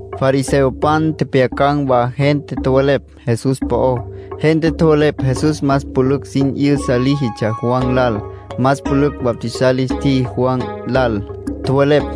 Fariseopan tjepjyacan̈ wa gente tjowelepj Jesús po'ó. Gente tjowelepj Jesús más pülücj sin 'yüsa líjitsja Juan lal. Más pülücj bautizar lis tjiji Juan lal, tjowelepj.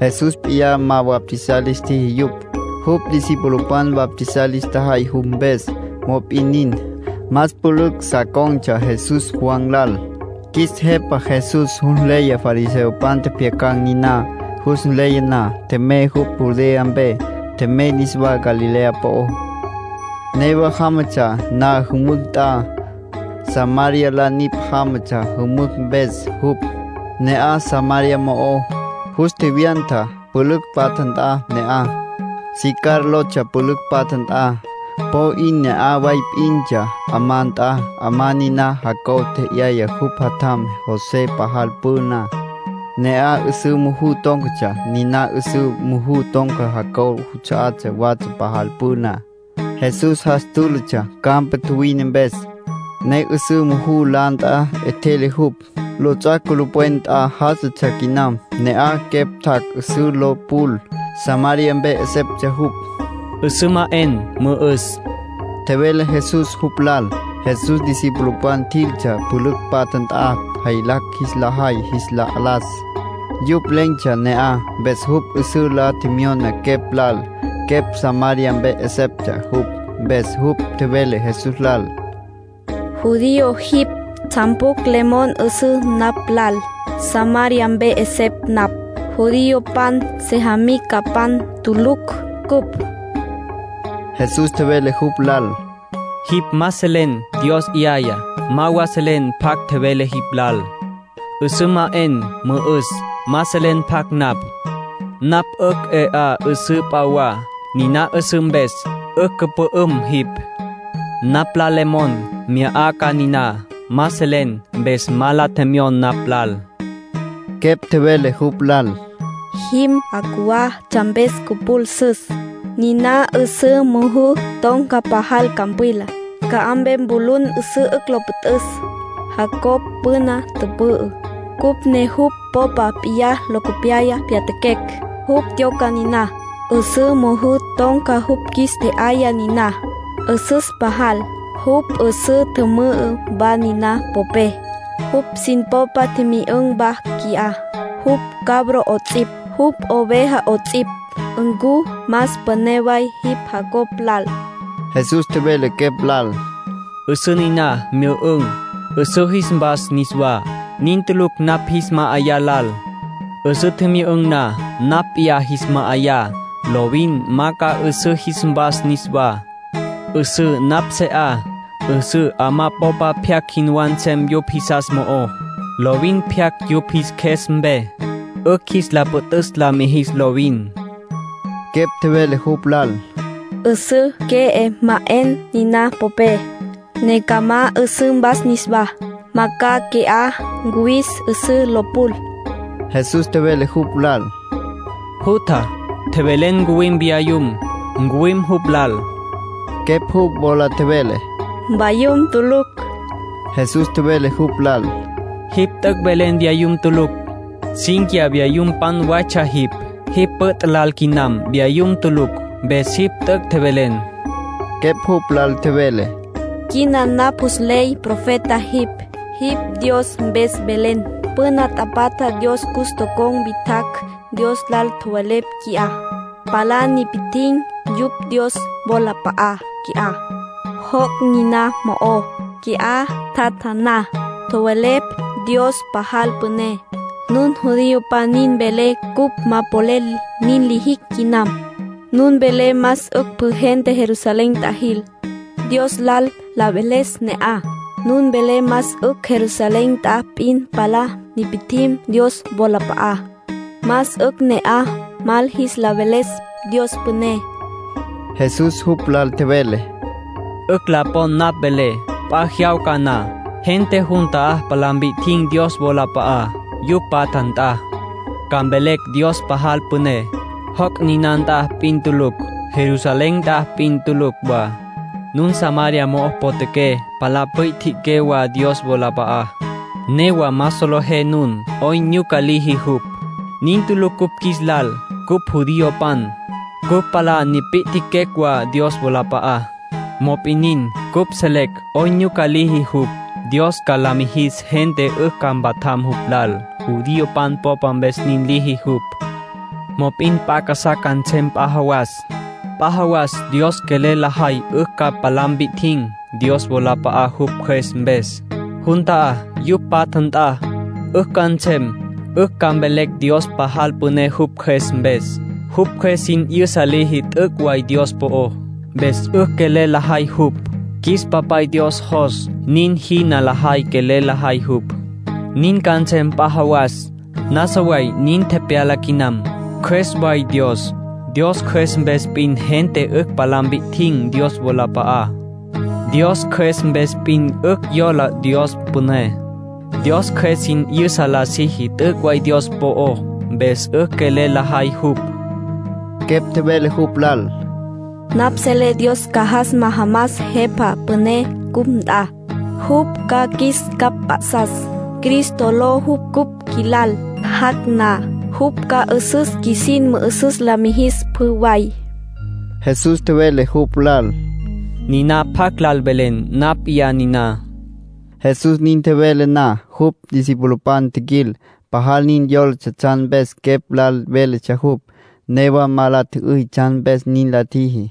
(Jesús p'iyá ma bautizar lis tjiji yupj. Jupj discipulopan bautizar lis tjajay jupj mpes. Mop'in nin, más pülücj sa con̈tsja Jesús Juan lal.) Qjuis Jepa Jesús jus nleya fariseopan tjepjyacan̈ niná. Jus nleya na, tjemey jupj Judea mpe. Tjemey niswá Galilea po'ó. Newa jámatsja na jümücj nt'a, Samaria la nipj jámatsja jümücj mpes jupj. Ne'aj Samaria mo'ó, jus tjevyanta pülücj patja nt'a ne'aj. Sicar lotsja pülücj patja nt'a. Po 'in ne'aj way p'intsja 'amá nt'a, 'amá niná Jacob tje'yaya jupj jatjam José pajal püna. Ne'aj 'üsǘ muju tón̈catsja, niná 'üsǘ muju ton̈ca Jacob juts'a'á watsja pajal püna. Jesús jas túlatsja campa tjuwine mpes, ne 'üsǘ muju la nt'a 'etjele jupj. Lots'ac' culupwen nt'a já'asatsja quinam. Ne'aj quepj tjac' 'üsǘ lo pul. Samaria mpe 'eseptsja jupj. —'Üsǘ ma 'en, mü'üs —tjevele Jesús jupj lal. Jesús discipulopan tjiltsja pülücj patja nt'a jaylacj jis la jay jis la las. Yupj len̈tsja ne'aj, mpes jupj 'üsǘ la tjemyona quepj lal. Quepj Samaria mpe 'eseptsja jupj, mpes jupj tjevele Jesús lal: —Judío jipj. ¿Tsjan pjucj le mon 'üsüs napj lal? Samaria mpe 'esepj napj. Judiopan sejamicapan tulucj cupj. Jesús tjevele jupj lal: —Jipj ma selen Dios 'yayá. Ma wa selen pjacj tjevele jipj lal: ‘'Üsǘ ma 'en, mü'üs’. Ma selen pjacj napj. Napj 'ücj 'e 'á 'üsǘ p'a wa, niná 'üsǘ mpes 'ücj cüpü'üm jipj. Napj lal le mon, mya 'a ca niná. Ma selen, mpes ma la tjemyon napj lal. Quepj tjevele jupj lal: —Jim 'a cjuwá tsjan mpes cüpul 'üsüs. Niná 'üsǘ muju ton̈ca pajal campwila. ¿Ca'aj mpe mpulun 'üsǘ 'ücj lo püt'üs? Jacob püna tüpü'ü, cupj ne jupj popa p'iyá locopyaya pyatjaquecj. Jupj tyoca niná, 'üsǘ muju ton̈cá. Jupj qjuis tje'yaya niná. 'Üsüs pajal. Jupj 'üsǘ tjümü'ü wa nina popé, jupj sin popa tjimyü'ün̈ wa qui'á, jupj cabro 'ots'ipj, jupj oveja 'ots'ipj. ¿Ncu más püné way jipj Jacob lal? Jesús tjevele quepj lal: —'Üsǘ niná myü'ün̈, 'üsǘ jis mvas niswá. Nin tulucj napj jis ma'ayá lal. 'Üsǘ tjimyü'ün̈ na, napj p'iyá jis ma'ayá, lovin ma ca 'üsǘ jis mvas niswá. 'Üsǘ napj se 'a, 'üsǘ 'amá popa pyacj jinwá nsem yupj jisas mo'ó. Lovin pyaca yupj jis qjues mpe, 'ücj jis la püt'üs la mijis lovin. Quepj tjevele jupj lal: —'Üsǘ que'e ma 'en niná popé, ne ca ma 'üsǘ mvas niswá. Ma ca qui'á ncuwis 'üsǘ lo pul. Jesús tjevele jupj lal: —Jutja, tjevele ncuwim vyayum. Ncuwim jupj lal. Quepj jupj wola tjevele: —Mvayum tulucj. Jesús tjevele jupj lal: —Jipj t'üc' velen vyayum tulucj. Cínquiya vyayumpan waytsja jipj. Jipj püt' lal quinam, vyayum tulucj. Mpes jipj t'üc' tjevelen. Quepj jupj lal tjevele: —Quina napj jus nley profeta jipj. Jipj Dios mpes velen. Püna tapatja Dios cus tocon̈ witjacj Dios lal tjowelepj qui'á. Palá nipi'tjin̈ yupj Dios wolap'a'á qui'á, joc' niná mo'ó. Qui'á tjatja na, tjowelepj Dios pajal püné. Nun judiopan nin welé cupj ma polel nin lijicj quinam. Nun welé más 'ücj pjü gente Jerusalén nt'a jil, Dios lal la veles ne'aj. Nun welé más 'ücj Jerusalén nt'a p'in palá nipi'tjin̈ Dios wolap'a'á, más 'ücj ne'aj mal jis la veles Dios püné. Jesús jupj lal tjevele: —'Ücj la pon napj velé. P'a jyawca na, gente jun ta'á palá mpi'tjin̈ Dios wolap'a'á, yupj patja nt'a. Ca mvelecj Dios pajal püné, joc' niná nt'a p'in tulucj, Jerusalén nt'a p'in tulucj wa. Nun Samaria mo'o potjaqué palá pwi'tjiqué wa Dios wolap'a'á, newa ma solejé nun 'oyn nyuca liji jupj. Nin tulucj cupj qjuis lal. Cupj judiopan, cupj palá nipi'tjiquecj wa Dios wolap'a'á, mop'in nin, cupj selecj 'oyn nyuca liji jupj. Dios ca la mijis gente 'ücj ca mpatjam jupj lal. Judiopan popa mpes nin liji jupj. Mop'in p'a casá ca nsem p'a jawas. P'a jawas Dios quelel lajay 'ücj ca palá mpi'tjin̈ Dios wolap'a'á jupj Cjües mpes. Jun ta'á, yupj patja nt'a, 'ücj ca nsem. 'Ücj ca mvelecj Dios pajal püné jupj Cjües mpes. Jupj Cjües sin 'yüsa liji t'üc' way Dios po'ó, mpes 'ücj quelel lajay jupj. Qjuis Papay Dios jos nin jina lajay quelel lajay jupj. Nin ca nsem p'a jawas. Nasa way nin tepyala quinam. Cjües way Dios. Dios Cjües mpes p'in gente 'ücj palá mpi'tjin̈ Dios wolap'a'á. Dios Cjües mpes p'in 'ücj yola Dios püné. Dios Cjües sin 'yüsa la siji t'üc' way Dios po'ó, mpes 'ücj quelel lajay jupj. Quepj tjevele jupj lal: —Napj selé Dios ca jas majamas Jepa Püné cupj nt'a. Jupj ca qjuis capj mp'a'sas. (Cristo ló jupj cupj qjuilal.) Jac' na, jupj ca 'üsüs qjuisin mü'üsüs la mijis pjü way. Jesús tjevele jupj lal: —Niná pjacj lal velen, napj mp'iyá niná. Jesús nin tjevele na, jupj discipulopan tjiquil. Pajal nin yólatsja tsjan mpes quepj lal véletsja jupj. Newa ma la tjü'üy tsjan mpes nin la tjiji.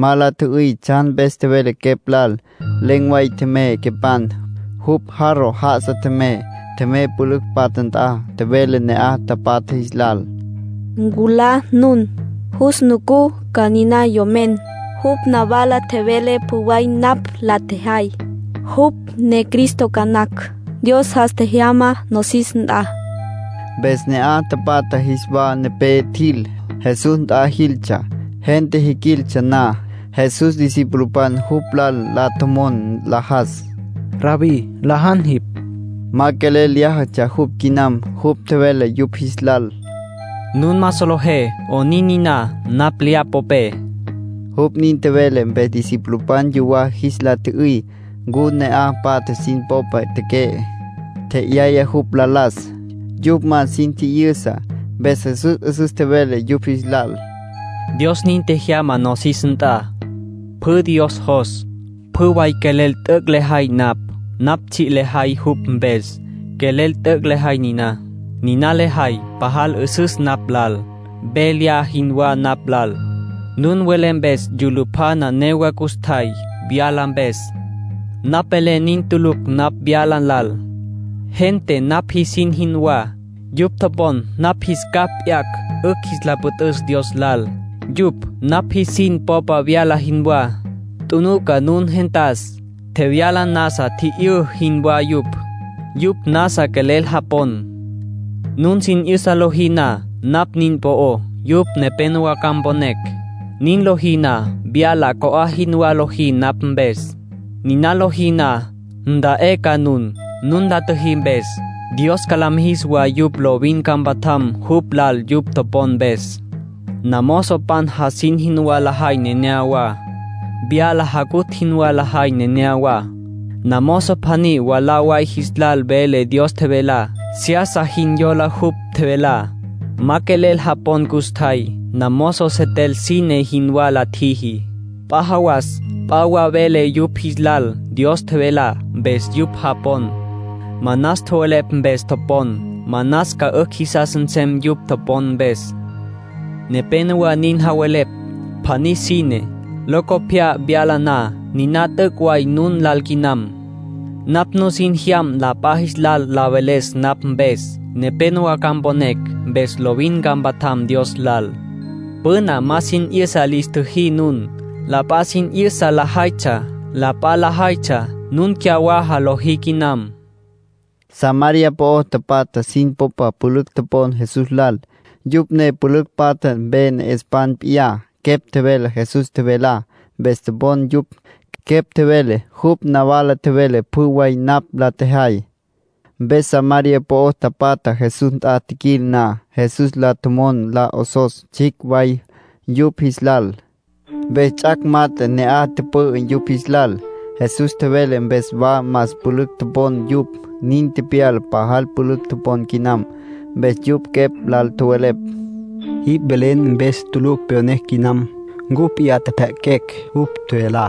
Ma la tjü'üy tsjan mpes tjevele quepj lal. Len̈ way tjemey quepan. Jupj jarro já'asa tjemey. Tjemey pülücj patja nt'a. Tjevele ne'aj tapatja jis lal: —Nculá nun. Jus nucú ca niná yomen. Jupj nawala tjevele pjü way napj la tjejay. Jupj ne ‘Cristo’ ca nacj. Dios jas tjejyama nosis nt'a. Mpes ne'aj tapatja jis wa nepé tjil. Jesús nt'a jiltsja. Gente jiquiltsja na, Jesús discipulopan jupj lal la tjomon nlajas: —Rabbí, nlajan jipj —tjowelepj yupj. Ma quelel lyájatsja jupj quinam. Jupj tjevele yupj jis lal: —Nun ma solejé 'onin niná, napj lya popé. Jupj nin tjevele mpes discipulopan yuwá jis la tjü'üy ncu ne'aj patja sin popa teque'e, tje'yaya jupj la las. Yupj ma sin tji'yüsa, mpes Jesús 'üsüs tjevele yupj jis lal: —Dios nin tjejyama nosis nt'a. Pjü Dios jos, pjü way quelel t'üc' lejay napj —tjevele jupj—. Napj tsji' lejay jupj mpes, quelel t'üc' lejay niná. Niná lejay pajal 'üsüs napj lal, ve lya jinwá napj lal. Nun welé mes yulupjana newa custjay, vyala mpes. Napj velé nin tulucj napj vyala lal. Gente napj jisin jinwá. Yupj topon napj jis capj p'yacj 'ücj jis la püt'üs Dios lal, yupj napj jisin popa vyala jinwá. Tjunuca nun gentas. Tjevyala nasa tji'yǘ jinwá yupj. Yupj nasa quelel japon. Nun sin 'yüsa lojí na napj nin po'ó, yupj nepénowa ca mponecj. Nin lojí na, vyala co'á jinwá lojí napj mpes. Niná lojí na, nta'é ca nun, nun la tjüjí mpes. Dios ca la mijis wa yupj lovin ca mpatjam jupj lal yupj topon mpes. ”Namozopan jasin jinwá lajay neneyawá. Vyala jacutj jinwá lajay neneyawá. Namozo pjaní mwalá way jis lal vele Dios tjevelá, seyasa jin yola jupj tjevelá. Ma quelel japon custjay. Namozo setel sine jinwá la tjiji. P'a jawas p'a wa vele yupj jis lal Dios tjevelá, mpes yupj japon. Manas tjowelepj mpes topon. Manas ca 'ücj jisas nsem yupj topon mpes. Nepénowa nin javelepj: ‘Pjaní sine, locopyá vyalaná’. Niná t'üc' way nun lal quinam. Napj nusin tjejyam la p'a jis lal la veles napj mpes. Nepénowa ca mponecj, mpes lovin ca mpatjam Dios lal. Püna ma sin 'yüsa lis tjüjí nun. La p'a sin 'yüsa lajaytsja. La p'a lajaytsja, nun cyawaja lojí quinam —tjevele Jesús. Samaria po'o tapatja sin popa pülücj topon Jesús lal, yupj ne pülücj patja mpe ne'espan p'iyá. Quepj tjevele Jesús tjevelá, mpes topon yupj. Quepj tjevele: —Jupj nawala tjevele pjü way napj la tjejay. Mpes Samaria po'o tapatja Jesús nt'a tjiquil na, Jesús lal la tjomon la 'osos tsjicj way yupj jis lal. Mpes ts'ac' mat'e ne'aj tüpü'ü yupj jis lal. Jesús tjevele mpes wa más pülücj topon yupj. Nin tepyala pajal pülücj topon quinam. Mpes yupj quepj lal tjowelepj: —Jipj velen mpes tulucj pyonecj quinam. Cupj p'iyá tjepjya'aquecj jupj tjevelá,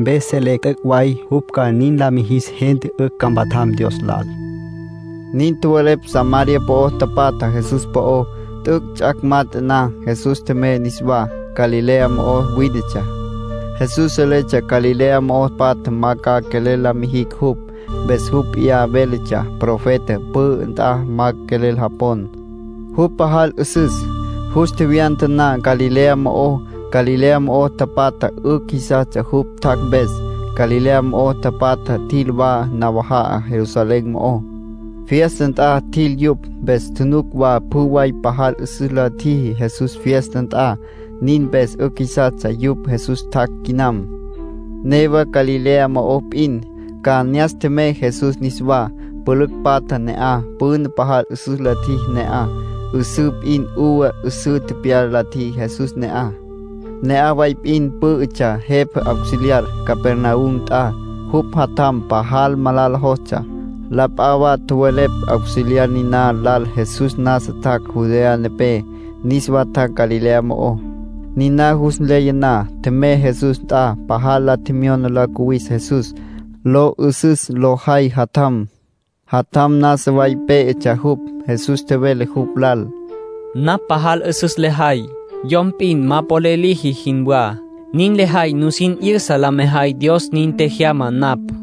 mpes selecj t'üc' way jupj ca nin la mijis gente 'ücj ca mpatjam Dios lal —nin tjowelepj Samaria po'o tapatja Jesús po'ó. T'üc' ts'ac' mat'e na, Jesús tjemey niswá. Galilea mo'o wínetsja. (Jesús seletsja Galilea mo'o patjá ma ca quelel la mijicj jupj, mpes jupj p'iyá véletsja: “Profeta pü'ü nt'a ma quelel japon jupj pajal 'üsüs”.) Jus tjevyanta na Galilea mo'ó, Galilea mo'o tapatja 'ücj jisastsja jupj tjac' mpes. Galilea mo'o tapatja tjil wa nawaja'a Jerusalén mo'ó. Fiesta nt'a tjil yupj, mpes tjunuc wa pjü way pajal 'üsüs la tjiji Jesús fiesta nt'a. Nin mpes 'ücj jisastsja yupj Jesús tjac' quinam. Newa Galilea mo'ó p'in, Caná ne'as tjemey Jesús niswá. Pülücj patja ne'aj. Püna pajal 'üsüs la tjiji ne'aj. 'Üsǘ p'in uva 'üsǘ tepyala la tjiji Jesús ne'aj. Ne'aj way p'in pǘ'ütsja jepa auxiliar, Capernaum nt'a. Jupj jatjam pajal malala jostsja. La p'a wa tjowelepj auxiliar niná lal Jesús nasa tjac' Judea nepé, niswá tjac' Galilea mo'ó. Niná jus nleya na, tjemey Jesús nt'a. Pajal la tjemyona lo cuwis Jesús, lo 'ü'süs lo jay jatjam. Jatjam nasa way pé'etsja jupj. Jesús tjevele jupj lal: —Napj pajal 'üsüs lejay, yom p'in ma polel liji jinwá. Nin lejay nusin 'yüsa la mejay Dios nin tjejyama napj.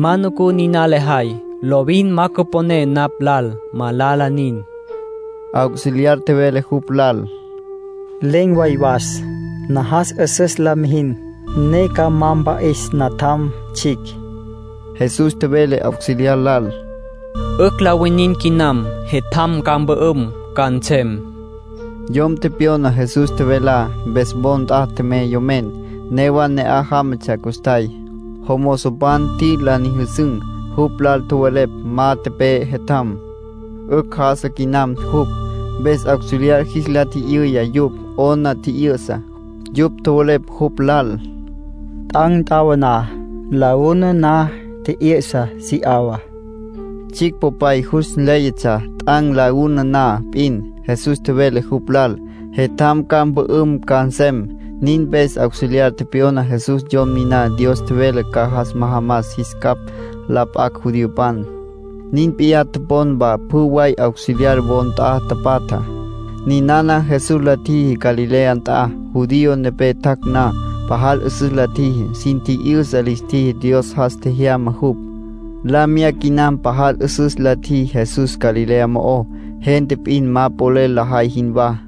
Ma nucú niná lejay, lovin ma cüponé napj lal. Malala nin. Auxiliar tjevele jupj lal: —Len̈ way was. Najas 'üsüs la mijin, ne ca ma mpa'is natjam tsjicj. Jesús tjevele auxiliar lal: —'Ücj la winin quinam. Jetjam ca mpü'üm ca nsem. Yom tepyona Jesús tjevelá, mpes wo nt'a tjemey yomen. Newa ne'aj jámatsja custjay, jomozopan tjiquil la nyüjüsün̈. Jupj lal tjowelepj: —Ma tepe'e jetjam. 'Ücj já'asa quinam jupj. Mpes auxiliar jis la tji'yüya yupj 'ona tji'yü'sa. Yupj tjowelepj jupj lal: —T'an̈ t'awaná, la una na tji'yü'sa si 'awa. Tsjicj popay jus nléyatsja t'an̈ la una na p'in, Jesús tjevele jupj lal: “Jetjam ca mpü'üm ca nsem”. Nin mpes auxiliar tepyona Jesús Yom niná Dios tjevele ca jas majamas jis capj la p'acj judiopan. Nin p'iyá topon wa pjü way auxiliar wo nt'a tapatjá. Ninana Jesús la tjijá Galilea nt'a, Judea mpe tjac' na. Pajal 'üsüs la tjiji, sin tji'yüsa lis tjiji Dios jas tjejyama jupj. La miyá quinam pajal 'üsüs la tjiji Jesús Galilea mo'ó, gente p'in ma polel lajay jinwá.